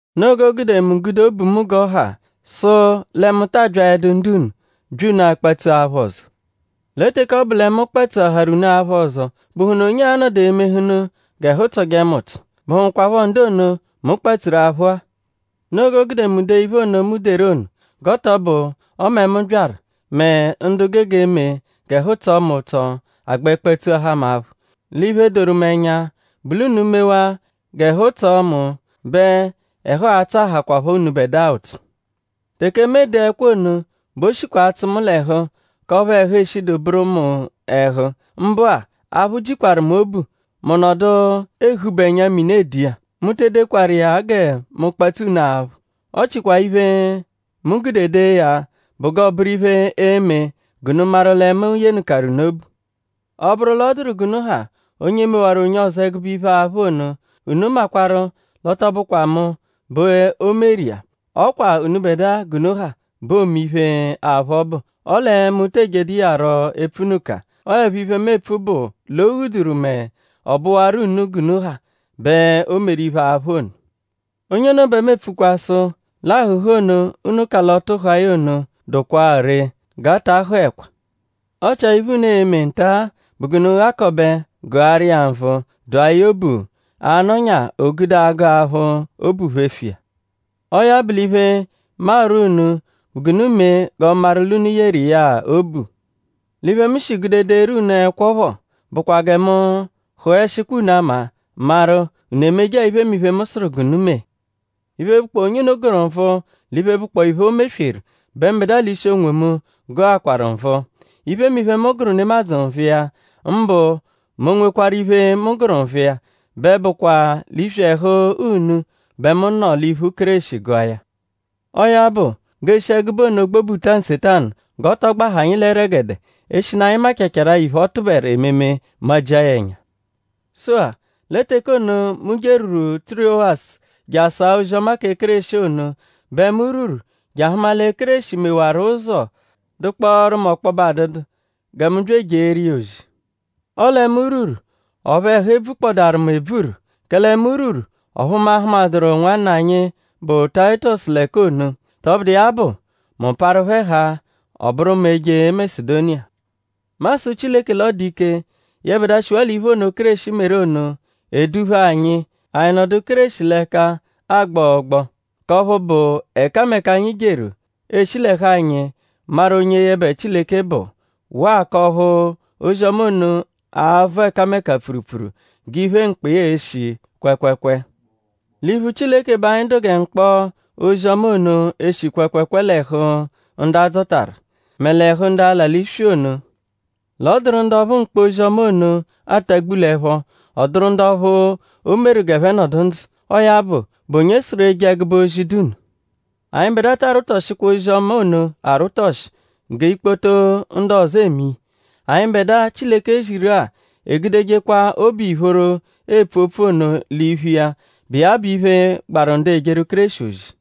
Noo g'o gude mu gude obu mu g'ọ ha sụ lẹ mu ta abyaẹdu ndu-unu; bya unu akpatsu aphụ ọzo. Lẹ teke ọ bụ lẹ mu kpatsuaharu unu aphụ ọzo;?bụhunu onye a-nọdu emehụnu g'ẹhu tsọje mu ụtso??Bụhukwapho ndu ono, mu kpatsuru aphụ-a? Noo g'o gude mu dee iphe ono, mu deru ono; g'ọ tọ bụ ọme mu byaru; mẹ ndu gege eme g'ẹhu tsọo mu ụtso agbẹ kpatsuahaa mu aphụ. L'iphe, doru mu ẹnya bụ l'unu -mewaa g'ẹhu tsọ mu bẹ ẹhu a-tsọahakwapho unubẹdua ụtso. Teke mu ede ẹkwo ono bẹ o shikwa atsụ mu l'ẹhu k'ọphu ẹhu eshidu bụru mu ẹhu; mbụ-a; aphụ jikwaru mu obu; mu nọdu ehubu ẹnya-mini ede iya. Mu te edekwaru iya gẹ mu kpatsu unu aphụ. Ọ chikwaa iphe, mu gude dee ya bụ g'ọoburu iphe, e-me g'unu maru lẹ mu yenụkaru unu obu. Ọ -bụru l'ọ dụru g'unu ha onye mewaru onye ọzo ẹgube iphe, aphụ ono; unu makwarụ l'ọ tọ bụkwa mu bẹ o meru iya; ọ kwa unubẹdua g'unu ha bẹ oome iphe, aphụ ọbu. Ọle mu tee jedu iya rọ epfunụka. Ọo 'ẹpho iphe, mu epfu bụ l'o ghuduru mẹ ọ bụwaru unu g'unu ha bẹ o meru iphe, aphụ ono. Onye ono bẹ mu epfukwa sụ l'ahụ̀hù ono, unu ka l'ọtu hụa ya ono dụkwaa ree; g'a ta hụekwa. Ọ chia iphe, unu e-me nta-a bụ g'unu ghakọbe gụaru iya nvụ dụa ya obu; a -nọnya o gude agụ aphụ; obu phefu iya. Ọo ya bụ l'iphe, mu arwọ unu bụ g'unu mee g'ọ maru l'unu yeru iya-a obu. L'iphe, mu shi gude deeru unu ẹkwo phọ bụkwa gẹ mu hụeshikwa unu ama; maru?unu emeje-a iphemiphe, mu sụru g'unu mee. Iphe, bụkpoo onye unu gụru nvụ l'iphe, bụkpoo iphe, o mesweru bẹ mbẹdua l'ishi onwomu gụakwaru nvụ. Iphemiphe, mu gụru nemadzụ nvụ iya; mbụ mẹ o -nwekwarụ iphe, mu gụru nvụ iya; bẹ bụkwa l'iswi ẹhu unu bẹ mu nọ l'iphu Kéreshi gụa ya. Ọo ya bụ g'eeshi ẹgube ono gbobuta Nsetanu g'ọ tọ gbahaa anyi l'ẹregede eshinu anyi machaarụ iphe, ọ tụberu ememe majia ya ẹnya. Sụ-a; lẹ teke ono, mu jerwuru Tirowasu je asa ozi-ọma kẹ Kéreshi ono bẹ mu rwuru je ahụma lẹ Kéreshi mewaru ụzo dụkpooru mu ọkpobe adụdu gẹ mu bya ejeeru iya ozi. Ọle mu rwuru ọphu ẹhu ebvukpọdaaru mu ebvuru; kẹle mu rwuru; ọphu mu ahụmaduru nwanna anyi, bụ Tayitọsu l'ẹka ono. Tọbudu iya bụ; mu parụ phẹ haa; ọ bụru mu eje Masedoniya. Mu asụ Chileke l'ọ dụ ike; yẹbedua, shiwaa l'iphe ono, Kéreshi meru ono; eduphe anyi; anyi nọdu Kéreshi l'ẹka agbọ ọgboo; k'ọphu bụ ẹkameka, anyi jeru eeshi l'ẹhu anyi maru onye yẹbe Chileke bụ; waa k'ọphu ozi-ọma ono a-vọ ẹkameka pfurupfuru g'iphe, mkpọ iya eshi kwẹekweekwee. L'iphu Chileke bẹ anyi dụ gẹ mkpọ ozi-ọma ono, eshi kwẹekweekwee l'ẹhu ndu a dzọtaru; mẹ l'ẹhu ndu ala l'iswi ono. L'ọ dụru ndu ọphu mkpọ ozi-ọma ono atagbu l'ẹpho; ọ dụru ndu ọphu o meru g'ẹphe nọdu ndzụ. Ọo ya bụ;?bụ onye sụru eje ẹgube ozi, dụ nno? Anyịbedua ta arwụtoshikwa ozi-ọma ono arwụtoshi gẹ ikpoto ndu ọzo eme iya. Anyịbedua, Chileke ziru-a egudejekwa obu ìphóró epfu opfu ono l'iphu iya, bụ iya bụ iphe, gbaru ndu ejeru Kéreshi ozi.